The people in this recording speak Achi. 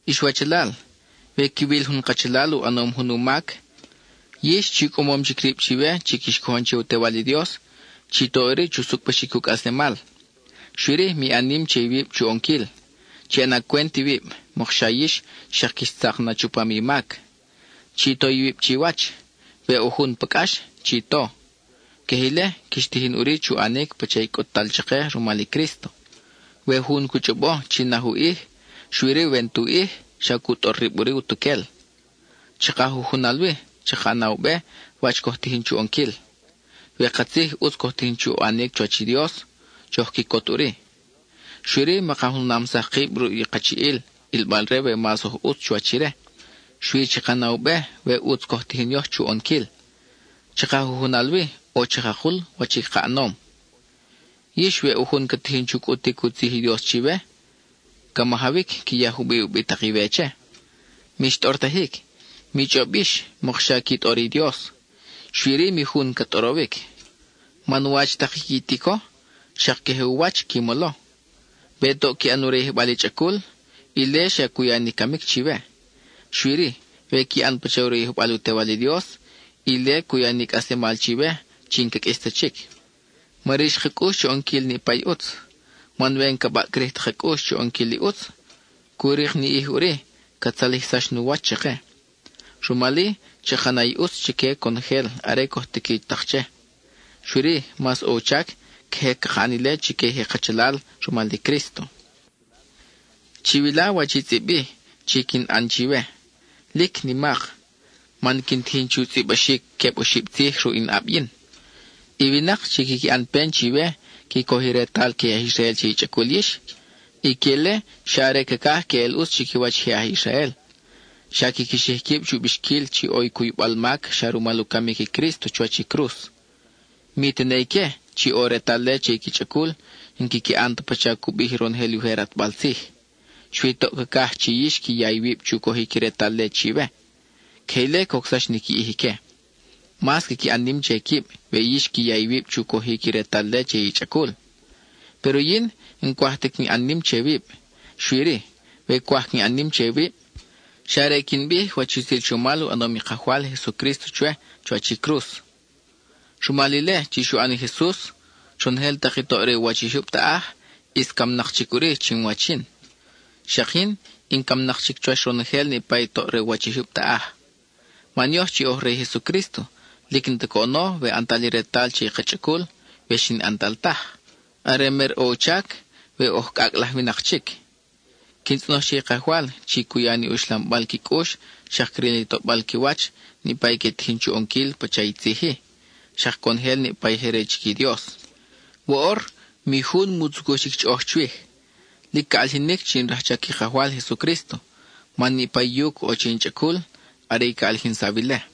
Ix wachalal, we quiwil jun kachalal u ʼanom jun u mac, yix chi u cʼamom chic rib chiwe chi quix cojon che i u Tewal i Dios, chi to ʼuri chu sucʼbaxic u cʼaslemal. Xui-ri, mi ʼan nim che iwib chu ʼonquil; chi ʼana cwent iwib, mokxa yix xak quix tzak na chupam i mac. Chi to iwib chiwach; we ʼo jun pa cʼax, chi to. Queje ile, quix tijin ʼuri chu ʼanic pacha i cʼut-tal chake rumal i Crísto. We jun cu chʼobo chi naj u ʼij, xui-ri we n-tu ʼij, xa cu tʼor rib ʼuri utuquel. Chaka jujunal wi, chaka na u be wach coj tijin chu ʼonquil; we katzij ʼutz coj tijin chu ʼanic chuwach i Dios, choj quicot ʼuri. Xui-ri maka junamsaj kib ruʼ jun kachiʼil, ʼilbal-re we mas oj ʼutz chuwach ire; xui chaka na u be we ʼutz coj tijin yoj chu ʼonquil. Chaka jujunal wi ʼo chakakul wach i ka ʼanom. Yix, we ʼo jun ca tijin chu cʼutic u tzij i Dios chiwe, ca majawic qui ya jubiʼ u bitak-iwe che. Mix tʼortajic, mi chʼob yix mokxa qui tʼor i Dios, xui-ri mi jun ca tʼorowic. Man wach tak i qui tico, xak queje u wach qui molo. We toʼ qui ʼan u rayijbal i chʼacul, ile xa cu ya ni camic chiwe. Xui-ri, we qui ʼan pacha u rayijbal u Tewal i Dios, ile cu ya ni i cʼaslemal chiwe chi n-ca qʼuis ta chic. Ma rix ka cʼux chu ʼonquil niʼpa i ʼutz, man we n-ca baʼcrij ta ka cʼux chu ʼonquil i ʼutz, cu rik ni ʼij ʼuri ca tzalijsax nu wach chake. Rumal-i, chaka ʼana i ʼutz chique conojel are coj tiqui tak che, xui-ri, mas ʼo u chac queje caka ʼan ile chique i je kachalal rumal i Crísto. Chiwila wach i tzʼib-i chi quin ʼan chiwe, ¡lic nimak! man quin tijin chu tzʼibaxic queb oxib tzij ruʼ in ʼab yin. I winak chi quiqui ʼan pen chiwe qui coj i retal que i aj Israel che i chʼacul yix, ique-le xa are cacaj queʼel ʼutz chiquiwach i aj Israel. Xa quiqui xij quib chu bixquil chi ʼo i cuybal mac xa rumal u camic i Crísto chuwach i cruz. Mi tene ique, chi ʼo i retal-le che i qui chʼacul, n-quiqui ʼan ta pacha cu bij ronojel i ujer ʼatbal tzij. Xui toʼ cacaj chi yix qui ya iwib chu cojic i retal-le chiwe; queje ile cocsax ni qui ʼij ique. Mas quiqui ʼan nim che quib we yix qui ya iwib chu cojic i retal-le che i chʼacul. Péro yin, n-cwaj ta quin ʼan nim che wib, xui-ri, we cwaj quin ʼan nim che wib, xa are quin bij wach i utzil chomal u ʼanom i Kajwal Jesucrísto chwe chuwach i cruz. Rumal ile chi xu ʼan i Jesus, ronojel tak i toʼ re u wach i jyub taʼaj, ʼis camnak chic ʼuri chinwach yin. Xak yin in camnak chic chuwach ronojel niʼpa i toʼ re u wach i jyub taʼaj. Man yoj chi oj re i Jesucrísto, lic n-ta coʼono we ʼantal i retal che i ka chʼacul, we xi n-ʼantal taj. Are mer ʼo u chac, we oj cʼacʼ laj winak chic. Quin tzʼonoj che i Kajwal chi cu ya ni uxlambal qui cʼux, xak cril ni tobal qui wach, niʼpa i que tijin chu ʼonquil pacha i tzij-i, xak conojel niʼpa i je re chic i Dios. Woʼor, mi jun mu tzucuj chic chʼoʼoj chwij; lic ca ʼalijinic chi in rajchac i Kajwal Jesucrísto man niʼpa i yuc ʼo che in chʼacul are ca ʼalijinsaw ile.